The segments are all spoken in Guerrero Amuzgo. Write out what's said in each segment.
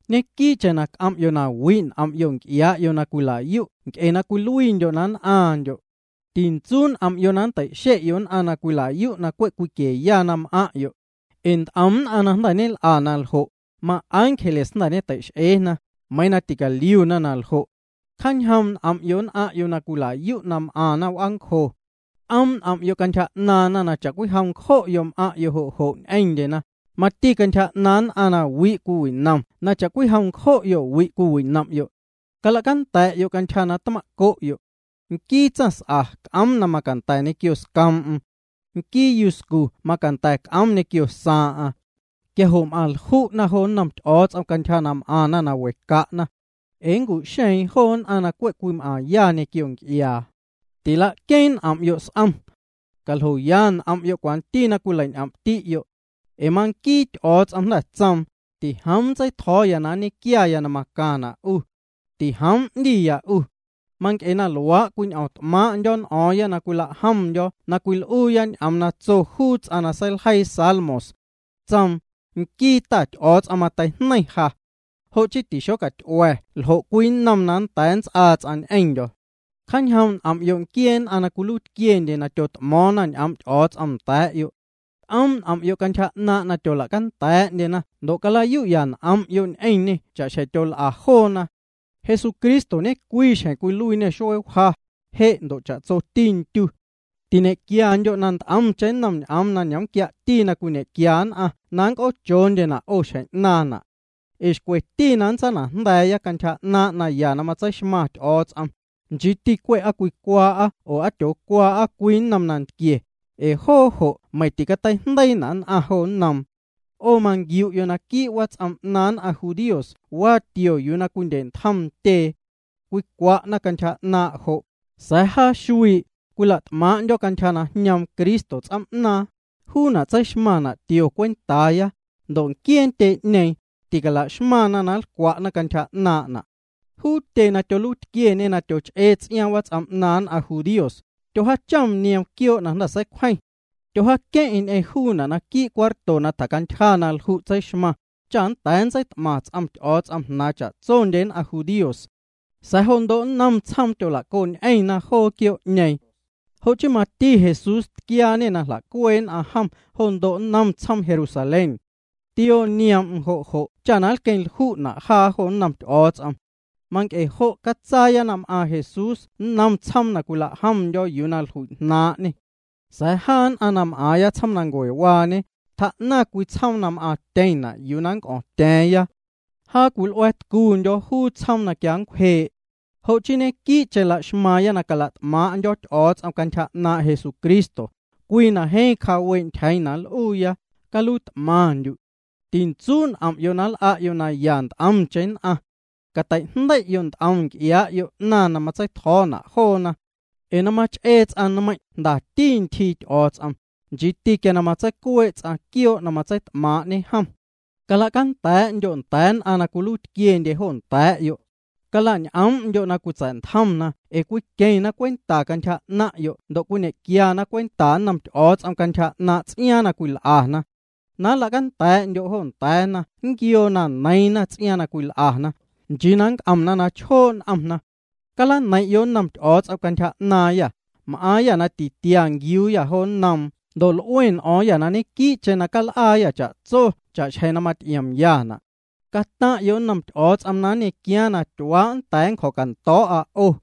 Ñequii'cheⁿ c'om'yo' na wi' n'om'yo' nc'iaa'yo' na cwila'yu' nc'e cwiluiindyo' na nn'aaⁿndyo'. Tintsuu' n'om'yo' na nntei'xe'yo' nn'aⁿ na cwila'yu' na cwe' cwiquieya na m'aⁿ'yo'. Ee nt'om nn'aⁿ na jnda̱ ñel'a na ljo', maángeles jnda̱ ñetei'x'eena, meiiⁿ ticaliuna na ljo'. Cjaañjoom' n'om'yo' nn'aⁿ'yo' na cwila'yu' na m'aⁿna w'aancjo. C'oom' n'om'yo' cantyja 'naaⁿna na cha'cwijom ncjo'yo' m'aⁿ'yo' jo' jo' ñ'eⁿndyena, mati cantyja 'naaⁿ nn'aⁿ na wi' cwiwinomna na cha'cwijom nncjo'yo' wi' cwiwinom'yo'. Cala'canda̱'yo' cantyja na tma'co'yo'. Nquii tsaⁿs'a c'oom na macanda̱ ñequio scoom'm. Nquii yuscu macanda̱ c'oom ñequio saaⁿ'aⁿ. Quia jo' m'aⁿ lju'na jo nnom Ty'o̱o̱ts'om cantyja na m'aⁿna na we ca'na. Ee nncu'xeeⁿ joo nn'aⁿ na cwe' cwim'aⁿya ñequio nc'iaa. Tila'queeⁿ n'om'yo' s'om. Caljoya n'om'yo' cwanti na cwileiñ'om'ti'yo'. Ee manquiiti Ty'o̱o̱ts'om jnda̱ tsoom: “Tijoom nntseitjo̱o̱ na nñequiaya na macaⁿna' 'u. Tijoom 'ndiya 'u.” Manc'e na luaa' cwiñ'o̱o̱ⁿt'maaⁿ'ndyo̱ n'o̱o̱ⁿya na cwila'jomndyo̱ na cwil'uuya ñ'oom na tso juu ts'aⁿ na seiljeii Salmos. Tsoom: Nquii Ta Ty'o̱o̱ts'om mateijneiⁿ ja. Jo' chii tixocaty'ua̱ ljo' cwii nnom na nnda̱a̱ nnts'aa ts'aⁿ ñ'eⁿndyo̱. Cjaañjoom' n'om'yo' nquiee nn'aⁿ na ñetuiitquiendye na tyot'mo̱o̱ⁿna ñ'oom' Ty'o̱o̱ts'om nda̱a̱'yo'. C'oom' n'om'yo' cantyja 'naaⁿ' na tyola'canda̱a̱'ndyena ndo' cala'yu'ya n'om'yo' ñ'eⁿñê cha'xjeⁿ tyol'a joona. Jesucristo ñecwii xjeⁿ cwiluiiñê xuee wja, je' ndo' cha'tsoti ndyu. Tiñequiandyo' na nt'omcheⁿ nnom ñ'oom na ñomquiana' na cwiñequia nn'aⁿ na nnc'oochoondyena' 'o xjeⁿ 'naaⁿna'. Ee xcweti na nntsanajnda̱a̱ya cantyja 'naaⁿ' naya na matseixmaⁿ Ty'o̱o̱ts'om, nchii cwe' aa cwicwaa'a oo aa ticwaa'a cwii nnom nantquie, ee joo jo' meiⁿ ticateijndeiina' nn'aⁿ jo nnoom. 'O manquiu'yo' naquii' wats'om 'naaⁿ nn'aⁿ judíos waa tio yuu na cwindye'ntjom ntyee. Cwicwa'na cantyja 'naaⁿ' jo', sa̱a̱ jaa xuii', cwila't'maaⁿ'ndyo̱ cantyja na jñoom Cristo ts'oom'naaⁿ, juuna' tseixmaⁿna' tio cwentaaya, ndo' nquiee ntyee'ñeeⁿ, tila'xmaⁿna na nlcwa'na cantyja 'naaⁿ'na'. Juu tyee na tyoluiitquieñe na tyoch'ee ts'iaaⁿ wats'om 'naaⁿ nn'aⁿ judíos, tyojaachom nioom quioo' na jnda̱ seicwjeⁿ. Tyojaaqueⁿ'eⁿ ñ'eⁿ juuna' naquii' cuarto na tjacantyja na lju' tseixmaⁿ, cha nnda̱a̱ nntseit'maⁿ ts'om Ty'o̱o̱ts'om jnaaⁿ cha'tsondye nn'aⁿ judíos. Sa̱a̱ jo ndo' nnom tsjoom tyola'coñ'eⁿna joo quioo'ñeeⁿ. Jo' chii mati Jesús tquiaañê na jla'cuee' nn'aⁿ jom jo ndo' nnom tsjoom Jerusalén. Tioo nioom'm jo' jo' cha queⁿlju'na' jaa jo nnom Ty'o̱o̱ts'om. Manc'e jo' catsaaya na m'aaⁿ Jesús nnom tsjoom na cwila'jomndyo̱ juu na jlui'jnaaⁿ'ñê. Sa̱a̱ jaa na m'aaⁿya tsjoomnancuewaañe, tjaa'naⁿ cwii tsjoom na m'aaⁿtyeⁿna' yuu ya nnc'o̱o̱ⁿtya̱a̱ⁿya. Jaa cwil'ua̱a̱tcuundyo̱ juu tsjoom na quia nncwjee'. Jo' chii ñequii'cheⁿ la'xmaaⁿya na cala't'maaⁿ'ndyo̱ Ty'o̱o̱ts'om cantyja 'naaⁿ' Jesucristo, cwii na jeeⁿ cjaawee' ntyjeeⁿ na nl'uuya: Caluiit'maⁿndyu'. Tintsuu' n'om'yo' na nl'a'yo' naya nt'omcheⁿ nn'aⁿ. Cateijndei'yo' nt'om nc'iaa'yo' 'naⁿ na matsei'tjo̱o̱na' joona. Ee na mach'ee ts'aⁿ nmeiⁿ' jndati ntyjii Ty'o̱o̱ts'om, nchiiti quia matseicuee' ts'aⁿ quioo' na matseit'maaⁿ'ñe jom. Cala'canda̱a̱'ndyo' nda̱a̱ nn'aⁿ na cwiluiitquiendye jo nda̱a̱'yo'. Cala'ñ'oom'ndyo' na cwitsa̱'ntjomna ee cwiqueⁿna cwenta cantyja 'naaⁿ'yo' ndo' nñequiana cwenta nnom Ty'o̱o̱ts'om cantyja 'naaⁿ' ts'iaaⁿ na cwil'ana. Na nla'canda̱a̱'ndyo' jo nda̱a̱na nquioo na neiiⁿna ts'iaaⁿ na cwil'ana, nchii na nnc'omna na chjoo' n'omna. Calaneiⁿ'yo' nnom Ty'o̱o̱ts'om cantyja 'naaⁿyâ. M'aaⁿyâ na titia nquiuuyâ jo nnoom ndo' l'ue n'o̱o̱ⁿyâ na ñequii'cheⁿ cal'aayâ cha'tso cha'xjeⁿ na maty'iomyana'. Cataⁿ'yo' nnom Ty'o̱o̱ts'om na nñequiaaⁿ na tyuaa' nnda̱a̱ nncjo̱cando̱o̱'nnda'a 'o.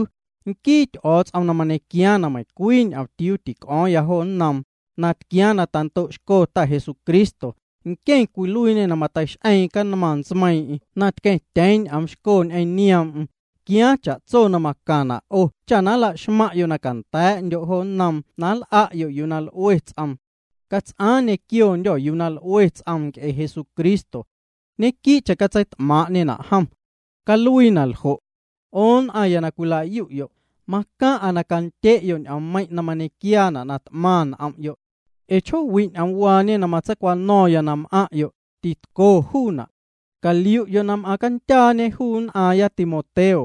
Nquii Ty'o̱o̱ts'om na mañequiaaⁿ na meiⁿcwii ñomtiuu tic'o̱o̱ⁿya jo nnoom, na tquiaaⁿ na tando'xco Ta Jesucristo, nqueⁿ na cwiluiinê na mateix'eeⁿ canmaⁿ ntsmeiiⁿ'eⁿ na tqueⁿtyeeⁿ ñ'oomxco ñ'eⁿ nioom'm, quiaaⁿ cha'tso na macaⁿna' 'o cha nla'xmaⁿ'yo' na canda̱a̱'ndyo' jo nnoom na nl'a'yo' yuu na l'ue ts'oom. Cats'aaⁿ ñequiondyô̱ yuu na l'ue ts'oom nc'e Jesucristo. Ñequii'cheⁿ catseit'maaⁿ'ñena' jom. Caluii na ljo'. 'O nn'aⁿya na cwilayu'yo', macaⁿ'a na candye'yo' ñ'oommeiⁿ' na mañequiaana' na t'maⁿ n'om'yo'. Ee chjoowi' ñ'oomwaañe na matseicwano̱ⁿya na m'aⁿ'yo', titco juuna'. Caliu'yo' na m'aaⁿcandyaañe juu nn'aaⁿya Timoteo.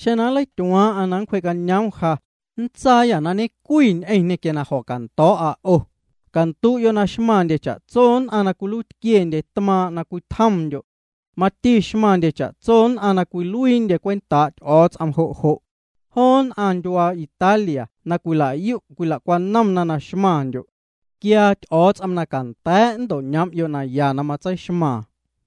Xeⁿ nleityuaaⁿ'aⁿ na nncwjee'cañoom ja, nntsaaya ñe'cwi ñ'eⁿñê quia na jo̱cando̱o̱'a 'o. Candu'yo' na xmaⁿndye cha'tso nn'aⁿ na cwiluiitquiendye tmaaⁿ' na cwitjomndyo'. Mati xmaⁿndye cha'tso nn'aⁿ na cwiluiindye cwentaa' Ty'o̱o̱ts'om jo' jo'. Joo nn'aⁿ ndyuaa Italia na cwila'yu' cwila'cwanomna na xmaⁿndyo'. Quiaa Ty'o̱o̱ts'om na canda̱a̱' na nto'ñoom'yo' naya na matseixmaaⁿ.